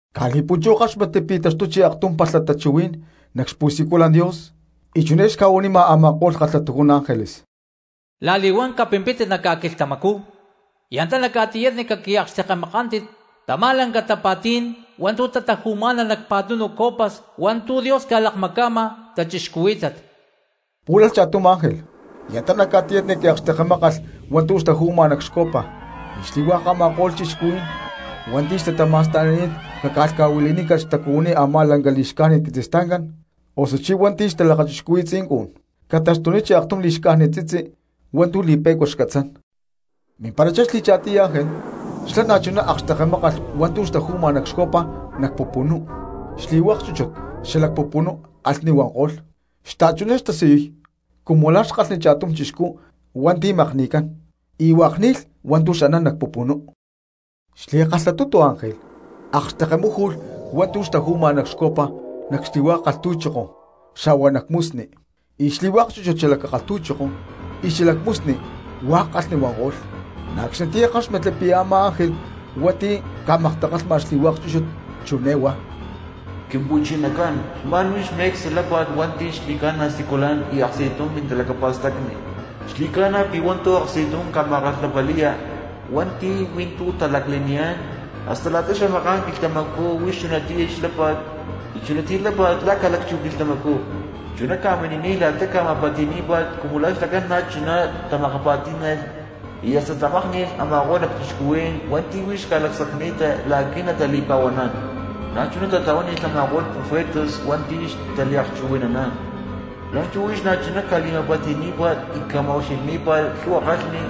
Caj li̠punchú ckáxmatli pi̠ taxtuchi aktum palha tachuhuí̠n nac xpu̠siculan Dios y chiné xca̠huanima a̠ma̠ko̠lh kalhatujún ángeles: —La̠li̠huán capimpítit nac ca̠quilhtamacú y antá nac ca̠tiyatni caqui̠akxtekemakántit tamá laclanca tapa̠tí̠n hua̠ntu̠ tataju̠má̠nalh nac pa̠tunu copas hua̠ntu̠ Dios ca̠lakmaca̠ma cristianos. Pú̠lalh cha̠tum ángel y antá nac ca̠tiyatni qui̠akxtekemákalh hua̠ntu̠ xtaju̠ma nac xcopa; y xli̠hua̠k a̠ma̠ko̠lh cristianos hua̠nti̠ xtatama̠sta̠ni̠t caca̠lhca̠huili̠nícalh xtacuhuiní a̠má lanca li̠xcájnit quitzistancán osuchí hua̠nti̠ xtalakachixcuhui̠y xtzincun, ca̠taxtuníchi aktum li̠xcájnit tzitzi pero li̠pe̠cua xcatzán. Mimparachá xli̠cha̠tiy ángel xlá na̠chuná akxtekemákalh hua̠ntu̠ xtaju̠ma nac xcopa nac pupunú, xli̠hua̠k chúchut xalac pupunú kalhni huanko̠lh, xta̠chuná xtasiyuy cumu la̠ xkalhni cha̠tum chixcú hua̠nti̠ makni̠cán, y hua̠k ni̠lh hua̠ntu̠ xanán nac pupunú. Xli̠kalhatutu ángel akxtekemáju̠lh hua̠ntu̠ xtaju̠ma nac xcopa nac xli̠hua̠k kalhtu̠choko xa̠hua nac musni, y xli̠hua̠k chúchut xalac kalhtu̠choko y xalac musni hua̠k kalhni huanko̠lh. Na̠ acxnitiyá ckáxmatli pi̠ a̠má ángel hua̠nti̠ ca̠maktakalha xli̠hua̠k chúchut chiné huá: Quimpu̠chinacán, xma̠n huix me̠cstu lápa̠t hua̠nti̠ xli̠ca̠na siculan y aksti̠tum mintalacapa̠stacni, xli̠ca̠na pi̠ hua̠ntu̠ aksti̠tum ca̠ma̠kalhapali̠ya hua̠nti̠ hui̠ntú talacle̠niyá̠n, hasta la̠ta xamaká̠n quilhtamacú huix chunatiyá xlápa̠t y chunatiyá lápa̠t la̠ ca̠lacchú quilhtamacú. Chuná ca̠mini̠niy la̠ta ca̠ma̠pa̠ti̠ní̠pa̠t cumu xlacán na̠chuná tamakapa̠tí̠nalh y hasta tamakni̠nankolh a̠ma̠ko̠lh cristianos hua̠nti̠ huix xca̠lacsacni̠ta la̠qui̠ natali̠pa̠huaná̠n, na̠chuná tatlahuánilh a̠ma̠ko̠lh profetas hua̠nti̠ xtaliakchuhui̠naná̠n. La̠nchú huix na̠chuná ca̠li̠ma̠pa̠ti̠ní̠pa̠t y ca̠ma̠ucxilhní̠pa̠t lhu̠hua kalhni.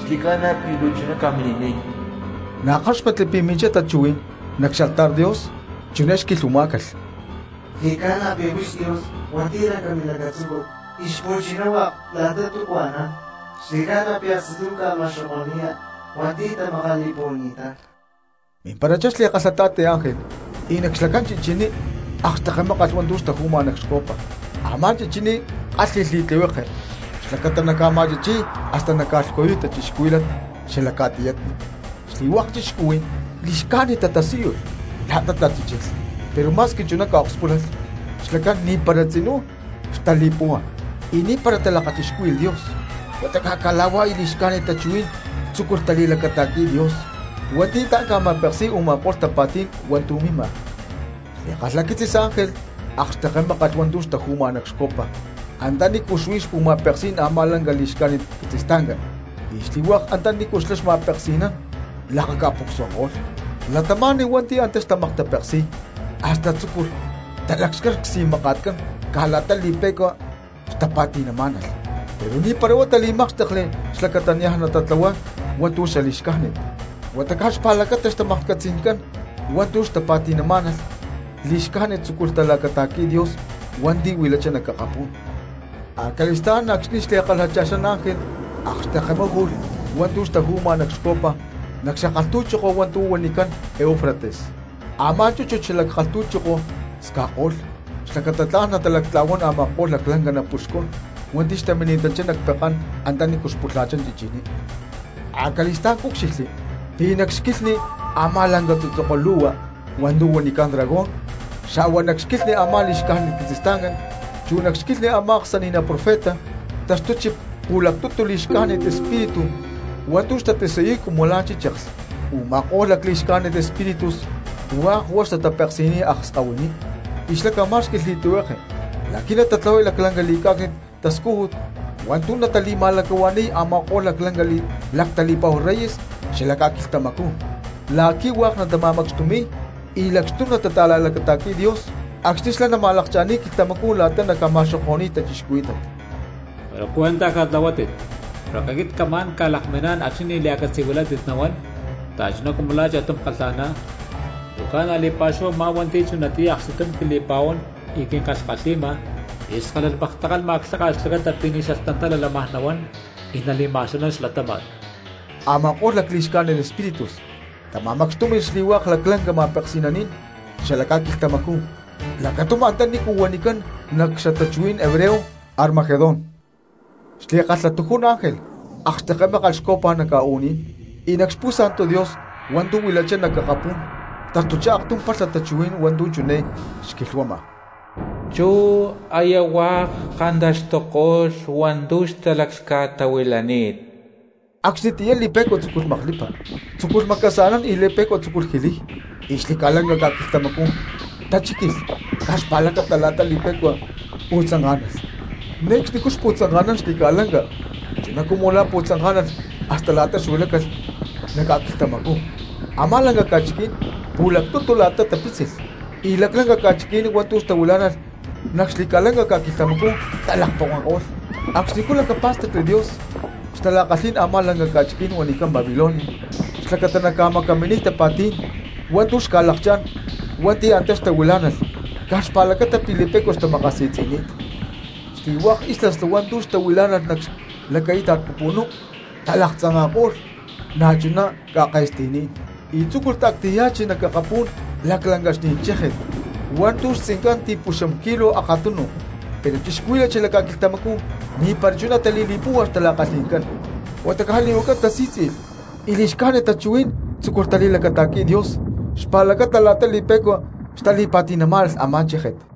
¡Xli̠ca̠na pi̠ luu chuná ca̠mini̠niy! Na̠ ckáxmatli pi̠ minchá tachuhuí̠n nac xaltar Dios, chiné xquilhuamá̠calh: —Xli̠cána pi̠ huix Dios hua̠nti̠ lanca milacatzúcut y xpu̠chiná hua̠k la̠ta túcu anán, xli̠ca̠na pi̠ aksti̠tum ca̠ma̠xoko̠ni̠ya hua̠nti̠ tamakali̠puhuani̠tán. Mimparachá xli̠kalhata̠ti ángel y nac xlacán chichiní akxtekemákalh hua̠ntu̠ xtaju̠ma nac xcopa, a̠má chichiní kálhi̠lh li̠tlihueke xlacata naca̠ma̠chichi̠y y hasta naca̠lhcuyuy cristianos xalac ca̠tiyatni. Xli̠hua̠k cristianos li̠xcájnit tatasíyulh la̠ta tachíchilh, pero ma̠squi chuná ca̠akspúlalh, xlacán ni̠para tzinú xtali̠púhua y ni̠para talakachixcúhui̠lh Dios huata caj cala̠huá y lacli̠xcájnit tachuhuí̠n tzúculh tali̠lacata̠qui̠y Dios hua̠nti̠ tla̠n ca̠ma̠peksi̠y u̠ma̠ko̠lh tapa̠tí̠n hua̠ntu̠ mima. Xli̠kalhaquitzis ángel akxtekemákalh hua̠ntu̠ xtaju̠ma nac xcopa antanícu xuí xpu̠ma̠peksí̠n a̠má lanca li̠xcájnit quitzistancán, y xli̠hua̠k antanícu xlá xma̠peksi̠nán lakaca̠pucsuananko̠lh. Cristianos hua̠nti̠ antá xtamaktapeksi̠y hasta tzúculh talacxcay csi̠maka̠tcán caj la̠ta li̠pe̠cua xtapa̠ti̠namá̠nalh. Pero ni̠para huá tali̠mákxtekli xlacata niaj natatlahuay hua̠ntu̠ li̠xcájnit, huata caj xpa̠lacata xtapa̠ti̠ncán hua̠ntu̠ xtamaklhcatzi̠má̠nalh li̠xcájnit tzúculh talacata̠qui̠y Dios hua̠nti̠ huilachá nac akapú̠n. Acali̠stá̠n acxni̠ xli̠kalhacha̠xán ángel akxtekemáju̠lh hua̠ntu̠ xtaju̠ma nac xcopa nac xakalhtu̠choko hua̠ntu̠ huanicán Eufrates; a̠má chúchut xalac kalhtu̠choko sca̠cko̠lh xlacata tla̠n natalactla̠huán a̠ma̠ko̠lh laclanca napuxcún hua̠nti̠ xtamima̠nanchá nac pekán antanícu pulha̠chá chichiní. Acali̠stá̠n cúcxilhli pi̠ nac xquilhni a̠má lanca tzutzoko lu̠hua hua̠ntu̠ huanicán dragón, xa̠hua nac xquilhni a̠má li̠xcájnit quitzistancán, chu nac xquilhni a̠má aksani̠ná profeta tataxtuchi pu̠lactutu lacli̠xcájnit espíritu hua̠ntu̠ xtatasiyuy cumu la̠ chícheklh. Uma̠kó̠lh lacli̠xcájnit espíritus hua̠k huá xtatapeksi̠niy akskahuiní, y xlá ca̠má̠xqui̠lh li̠tlihueke la̠qui̠ natatlahuay laclanca li̠cá̠cni̠t tascújut hua̠ntu̠ natali̠ma̠lacahua̠ni̠y a̠ma̠ko̠lh laclanca lactali̠pa̠hu reyes xalac ca̠quilhtamacú, la̠qui̠ hua̠k natama̠macxtumi̠y y lacxtum natata̠la̠lacata̠qui̠y Dios acxni̠ xlá nama̠lakcha̠ni̠y quilhtamacú la̠ta naca̠ma̠xoko̠ni̠y cristianos. “Pero cuentaj catlahuátit, porque aquit camá̠n ca̠lakminá̠n acxni̠ ni̠ lia̠catzi̠huilátit nahuán, xtachuná cumu la̠ cha̠tum kalha̠ná. Luu ca̠na li̠pa̠xúhu a̠má hua̠nti̠ chunatiyá aksti̠tum quili̠pa̠huán y quinkalhkalhi̠ma, y skálalh maktakalhma clháka̠t xlacata pi̠ ni̠ xalhtantala lámaj nahuán y nali̠ma̠xanán xlatáma̠t.” Ama̠ko̠lh lacli̠xcájnit espíritus tama̠macxtúmi̠lh xli̠hua̠k laclanca ma̠peksi̠naní̠n xalac ca̠quilhtamacú lacatum antanícu huanicán nac xtachuhuí̠n hebreo Armagedón. Xli̠kalhatujún ángel akxtekemákalh xcopa nac ca̠u̠ní̠n, y nac xpu̠sa̠ntu Dios hua̠ntu̠ huilachá nac akapú̠n taxtuchá aktum palha tachuhuí̠n hua̠ntu̠ chiné xquilhuama: —¡Chú aya hua̠k kantaxtuko̠lh hua̠ntu̠ xtalhca̠tahuilani̠t! Acxnitiyá li̠pe̠cua tzúculh maklipa, tzúculh macasa̠nán y li̠pe̠cua tzúculh jiliy, y xli̠ca̠lanca ca̠quilhtamacú tachíquilh caj xpa̠lacata la̠ta li̠pe̠cua pu̠tzanká̠nalh, ne̠cxnicú a̠ xpu̠tzanka̠nán xli̠lanca chuná cumu la̠ pu̠tzanká̠nalh hasta la̠ta huilácalh nac ca̠quilhtamacú. Amá lanca ca̠chiquí̠n pu̠lactutu la̠ta tapítzilh, y laclanca ca̠chiqui̠ní̠n hua̠ntu̠ tahuilá̠nalh nac xli̠ca̠lanca ca̠quilhtamacú talakponkako̠lh. Acxnicú lacapá̠stacli Dios xtala̠kalhí̠n a̠má lanca ca̠chiquí̠n huanicán Babilonia xlacata naca̠macaminiy tapa̠tí̠n hua̠ntu̠ xca̠lakchá̠n hua̠nti̠ antá xtahuilá̠nalh caj xpa̠lacata pi̠ li̠pe̠cua xtamakasi̠tzi̠ni̠t. Xli̠hua̠k islas hua̠ntu̠ xtahuilá̠nalh nac xlaquíta̠t pupunú talaktzanka̠ko̠lh, na̠chuná ca̠ke̠sti̠ní̠n, y tzúculh ta̠ctaya̠chi nac akapú̠n laclancaxní̠n chéje̠t hua̠ntu̠ xtzincán ti̠puxam kilo akatunu, pero cristianos xalac ca̠quilhtamacú ni̠para chuná tali̠li̠púhua xtala̠kalhi̠ncán, huata caj li̠huaca tasí̠tzi̠lh y lacli̠xcájnit tachuhuí̠n tzúculh tali̠lacata̠qui̠y Dios xpa̠lacata la̠ta li̠pe̠cua xtali̠pa̠ti̠namá̠nalh a̠má chéje̠t.